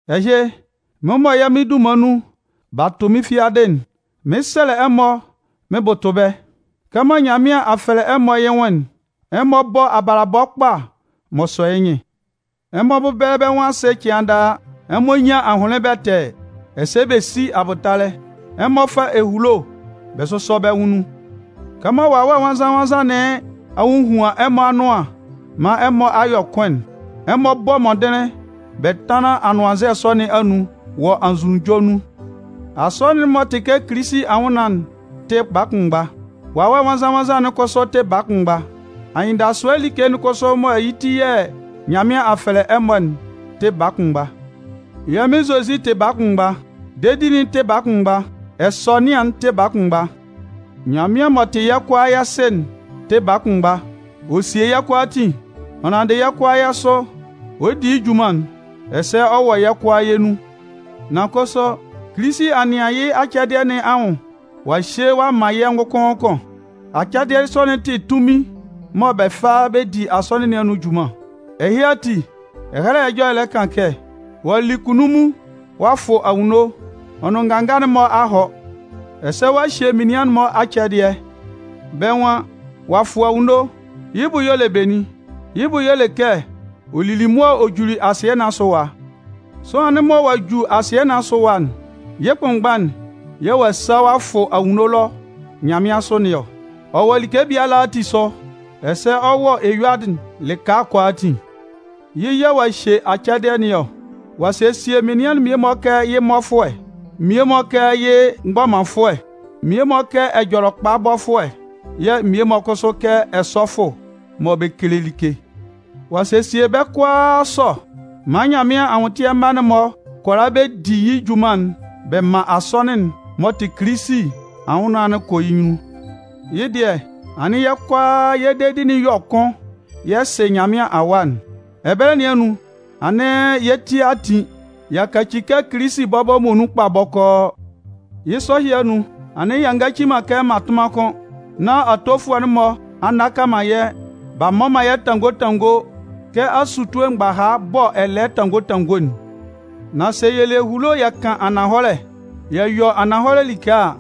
Ɛhɩ, mɩ́n mɔ yɛ́ Mɩn dunman nun b'a tʋ mɩ́n fiadɩ'n, mɩn 'sɛlɛ ɛmɔ mɩn bʋtʋ bɛ́: Kɛmɔ Nyanmɩan a fɛlɛ ɛmɔ yɩ́ nwʋn'n, ɛmɔ bɔ́ abalabɔ kpa m'ɔ sɔ yɩ́ nyɩn. Ɛmɔ bɛ́bɛlɛ bɛ́ nwʋn asɩ cɩan daa. Ɛmɔ nyán ahʋnlɩn bɛtɛɛ, ɛsɛ bɛ sí abʋtalɛ. Ɛmɔ fá ehulo bɛ sʋ́sɔ bɛ́ nwʋn nun. Kɛmɔ Wawɛ Nwannzan-nwannzan nɩn a hohuan ɛmɔ anʋan maan ɛmɔ a yɔ kʋn'n, ɛmɔ bɔ́ mɔndɩnlɩn bɛ tánlan anʋannzɛ sɔ nɩn anun wɔ anzʋnunjɔ nun. Asɔnɩn'n m'ɔ tɩ kɛ Kilisi anwʋnnaan'n tɩ baa kʋnmgba. Wawɛ Nwannzan-nwannzan'n kʋsʋ tɩ baa kʋnmgba. Anyɩndasʋɛ like'n kʋsʋ mɔ yɩ́ ti yɛ̂ Nyanmɩan a fɛlɛ ɛmɔ'n tɩ baa kʋnmgba. Yɛ́ Mɩn Zozi tɩ baa kʋnmgba. Dedi'n tɩ baa kʋnmgba. Ɛsɔnɩan'n tɩ baa kʋnmgba. Nyanmɩan m'ɔ tɩ yɛ́ kʋalaa yɛ́ Sɩ'n tɩ baa kʋnmgba. Ɔ sie yɛ́ kʋalaatin. Ɔ nanndɩ yɛ́ kʋalaa yɛ́ sʋ, ɔ di yɩ́ junman'n. Ɛsɛ ɔ wɔ yɛ́ kʋalaa yɛ́ nun. Nan kʋsʋ, Kilisi a nɩan yɩ́ acɛdɩɛ nɩn anwʋn ɔ'a hye ɔ'a man yɛ́ ngʋkʋn ngʋkʋn. Acɛdɩɛ sɔ'n tɩ tunmin mɔ bɛ fa bɛ di Asɔnɩn nɩn anun junman. Ɛhɩ ati, Ɛhɛlɛ Ɛjɔlɛ'n lɛ kan kɛ: Ɔ'a li kunnunmun ɔ'a fʋ anwunno ɔ nʋn nganga'n-mɔ a hɔ. Ɛsɛ ɔ'a hye menian'n-mɔ acɛdɩɛ. Bɛ́ nwan: “Ɔ'a fʋ anwunno”. Yɩ́ bʋ y'ɔ le benin? Yɩ́ bʋ y'ɔ le kɛ ɔ lili mʋa ɔ juli asɩɛ nɩn asʋ ɛwa. Sʋanlan'n mɔ ɔ'a ju asɩɛ nɩn asʋ ɛwa'n, yɩ́ kʋnmgba'n yɛ̂ ɔ'a sa ɔ'a fʋ anwunno ɛlɔ nyanmɩansʋ nɩn ɔ. Ɔ wɔ like biala ati asʋ, ɛsɛ ɔ wɔ eyuadɩ'n lɩka kʋalaatin. Yɩ́ yɛ̂ ɔ'a hye acɛdɩɛ nɩn ɔ. Ɔ'a sesie menian'n mmie-mɔ kɛ yɩ́ mmɔfʋɛ, mmie-mɔ kɛ yɩ́ mgbɔmanfʋɛ, mmie-mɔ kɛ Ɛjɔlɛkpabɔfʋɛ yɛ̂ mmie-mɔ kʋsʋ kɛ ɛsɔfʋ mɔ bɛ kele like. Ɔ'a sesie bɛ́ kʋalaa sɔ maan Nyanmɩan anwʋntɩɛ mma'n-mɔ kʋala bɛ di yɩ́ junman'n bɛ man Asɔnɩn'n m'ɔ tɩ Kilisi anwʋnnaan'n kɔ yɩ́ nyunnun. Yɩ́ dɩɛ, anɩn yɛ́ kʋalaa yɛ́ dedi'n yɔ kʋn yɛ sɩ Nyanmɩan Awa'n. Ɛbɛlɛ nɩn anun, anɩn yɛ́ ti a tin, y'a kaci kɛ Kilisi bɔbɔ muonun kpa bɔkɔɔ. Yɩ́ sɔ ɛhɩ anun, anɩn yɛ ngaci man kɛ mmatʋnman kʋ́n, nán atofʋɛ'n-mɔ a nnaka man yɛ́, b'a mmɔ man yɛ́ tanngo tanngo kɛ asutue mgbaha bɔ ɛlɛɛ tanngo tanngo'n. Nan sɛ yɛ le ehulo yɛ kan ananhɔlɛ, yɛ yɔ ananhɔlɛ like a,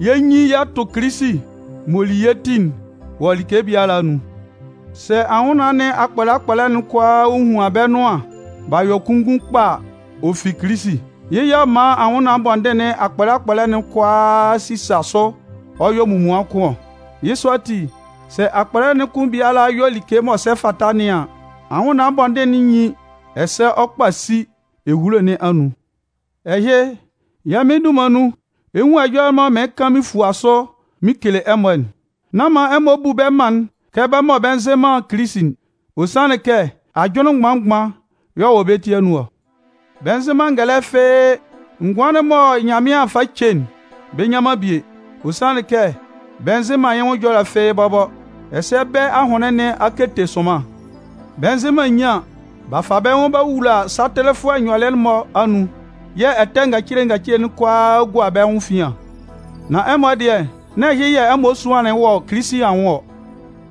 yɛ 'nyin yɛ tʋ Kilisi m'ɔ li yɛ́ ti'n wɔ like biala anun. Sɛ anwʋnnaan nɩn akpɔlɛ akpɔlɛ'n kʋalaa a hohuan bɛ́ nʋan b'a yɔ kunngun kpa a, ɔ fi Kilisi. Yɩ́ yɛ̂ ɔ man anwʋnnaan bɔndɩn nɩn akpɔlɛ akpɔlɛ'n kʋalaa sisa sʋ ɔ yɔ munmuan kʋn ɔ. Yɩ́ sɔ ati, sɛ akpɔlɛ'n kʋn biala yɔ like m'ɔ sɛ fata nɩn an, anwʋnnaan bɔndɩn'n nyin ɛsɛ ɔ kpasi ehulo nɩn anun. Ɛhɩ, yɛ́ Mɩn dunman nun, ɛ 'nwun ɛjɔlɛ mɔ mɩɩn kan mɩn fua sʋ mɩn kele ɛmɔ'n. Nán man ɛmɔ bu bɛ́ mân'n kɛ bɛ́ mɔ bɛ nzɩ man Kilisi'n. Ɔ sanlɩn kɛ ajʋnlɩn mgban-mgban y'ɔ wɔ bɛ́ ti anun ɔ. Bɛ nzɩ man ngɛlɛ fɩ́ɩ́. Ngʋan'n mɔ Nyanmɩan fa ce'n, bɛ nnyan man bie. Ɔ sanlɩn kɛ bɛ nzɩ man yɩ́ nwʋn ɛjɔlɛ fɩ́ɩ́ bɔbɔ. Ɛsɛ bɛ́ ahʋnlɩn nɩn a kete sʋnman. Bɛ nzɩ man nyian. B'a fa bɛ́ nwʋn b'a wula satɩlɩfʋɛ nyɔlɩɛ'n-mɔ anun yɛ̂ ɛtɛ ngacile ngacile'n kʋalaa gua bɛ́ nwʋn efian. Nan ɛmɔ dɩɛ, nán ɛhɩ yɛ̂ ɛmɔ suanlɩn wɔ Kilisi anwʋn ɔ.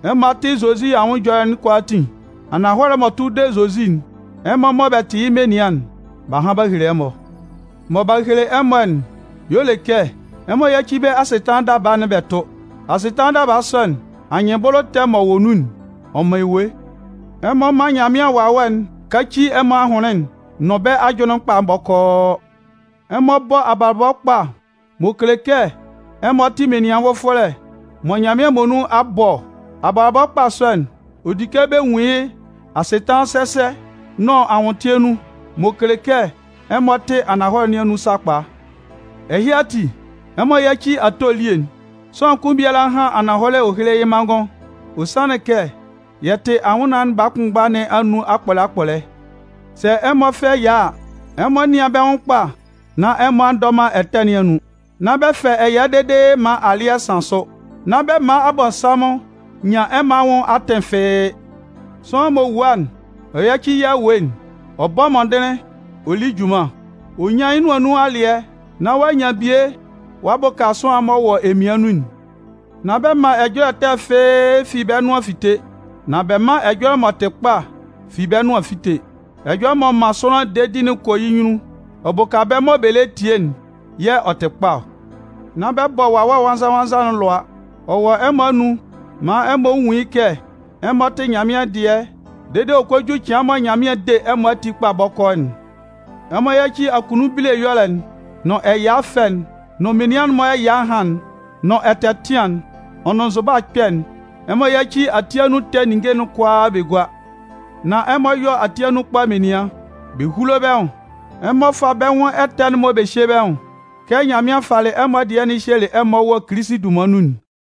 Ɛmɔ a tɩ Zozi anwʋn ɛjɔlɛ'n kʋalaatin. Ananhɔlɛ'n m'ɔ tʋ de Zozi'n, ɛmɔ mɔ bɛ tɩ yɩ́ menian'n, b'a han b'a hele ɛmɔ. Mɔ b'a hele ɛmɔ'n y'ɔ le kɛ ɛmɔ yáci bɛ́ asɩtanlan daba'n bɛ tʋ́. Asɩtanlan daba sɔ'n, anyɩnbʋlʋ ɛtɛ m'ɔ wɔ nun'n, ɔ man ewue. Ɛmɔ mán Nyanmɩan Wawɛ'n káci ɛmɔ ahʋnlɩn'n nʋn bɛ́ ajʋnlɩn'n kpa bɔkɔɔ. Ɛmɔ bɔ́ abalabɔ kpa m'ɔ kele kɛ ɛmɔ tɩ menian nvʋfɔlɛ mɔ Nyanmɩan muonun a bɔ ɔ. Abalabɔ kpa sɔ'n, ɔ di kɛ bɛ nwun yɩ́ asɩtanlan sɛsɛ nʋn anwʋntɩɛ nun, m'ɔ kele kɛ ɛmɔ tɩ ananhɔlɛ nɩn anun sakpa. Ɛhɩ ati, ɛmɔ yáci ato elie'n. Sʋanlan kʋn biala hán ananhɔlɛ héle yɩ́ manngʋn. Ɔ sanlɩn kɛ yɛ tɩ anwʋnnaan baa kʋnmgba nɩn anun akpɔlɛ akpɔlɛ. Sɛ ɛmɔ fɛ ɛya a, ɛmɔ nɩ́an bɛ́ nwʋn kpa nán ɛmɔ a ndɔ man ɛtɛ nɩn anun. Nán bɛ fɛ ɛya dede maan alɩ́ɛ san sʋ. Nán bɛ man Abɔnsanmʋn nyan ɛmɔ anwʋn atɩn fɩ́ɩ́. Sʋanlan m'ɔ wua'n, ɔ yáci yɩ́ awue'n. Ɔ bɔ́ mɔndɩnlɩn, ɔ lí junman. Ɔ nyán yɩ́ nʋan nun alɩɛ nán ɔ'a nyan bie ɔ'a bʋka sʋanlan m'ɔ wɔ emian nun'n. Nán bɛ man ɛjɔlɛ ɛtɛ fɩ́ɩ́ fi bɛ́ nʋan fite. Nan bɛ mán ɛjɔlɛ m'ɔ tɩ kpa fi bɛ́ nʋan fíte. Ɛjɔlɛ m'ɔ man sʋanlan dedi'n kɔ yɩ́ nyunnun, ɔ bʋka bɛ́ mɔ bɛ lɛ tie'n yɛ̂ ɔ tɩ kpa ɔ. Nán bɛ bɔ Wawɛ Nwannzan-nwannzan alʋa. Ɔ wɔ ɛmɔ anun maan ɛmɔ nwun yɩ́ kɛ ɛmɔ tɩ Nyanmɩan dɩɛ dede ɔ kɔ ju cɩan mɔ Nyanmɩan 'de ɛmɔ ati kpa bɔkɔɔ'n. Ɛmɔ yáci akunnun bile ɛyɔlɛ'n nʋn ɛya ɛfɛ'n, nʋn menian'n-mɔ ɛya ɛhan'n nʋn ɛtɛtɩan'n, ɔ nʋn nzʋba ɛkpɛ'n. Ɛmɔ yáci ati anun ɛtɛ ninnge'n kʋalaa bɛ gúa. Nan ɛmɔ yɔ́ ati anun kpa menian, bɛ húlo bɛ́ nwʋn. Ɛmɔ fá bɛ́ nwʋn ɛtɛ'n-mɔ bɛ hyé bɛ́ nwʋn kɛ Nyanmɩan falɩ ɛmɔ dɩɛ'n hyelɩ ɛmɔ wɔ Kilisi dunman nun'n.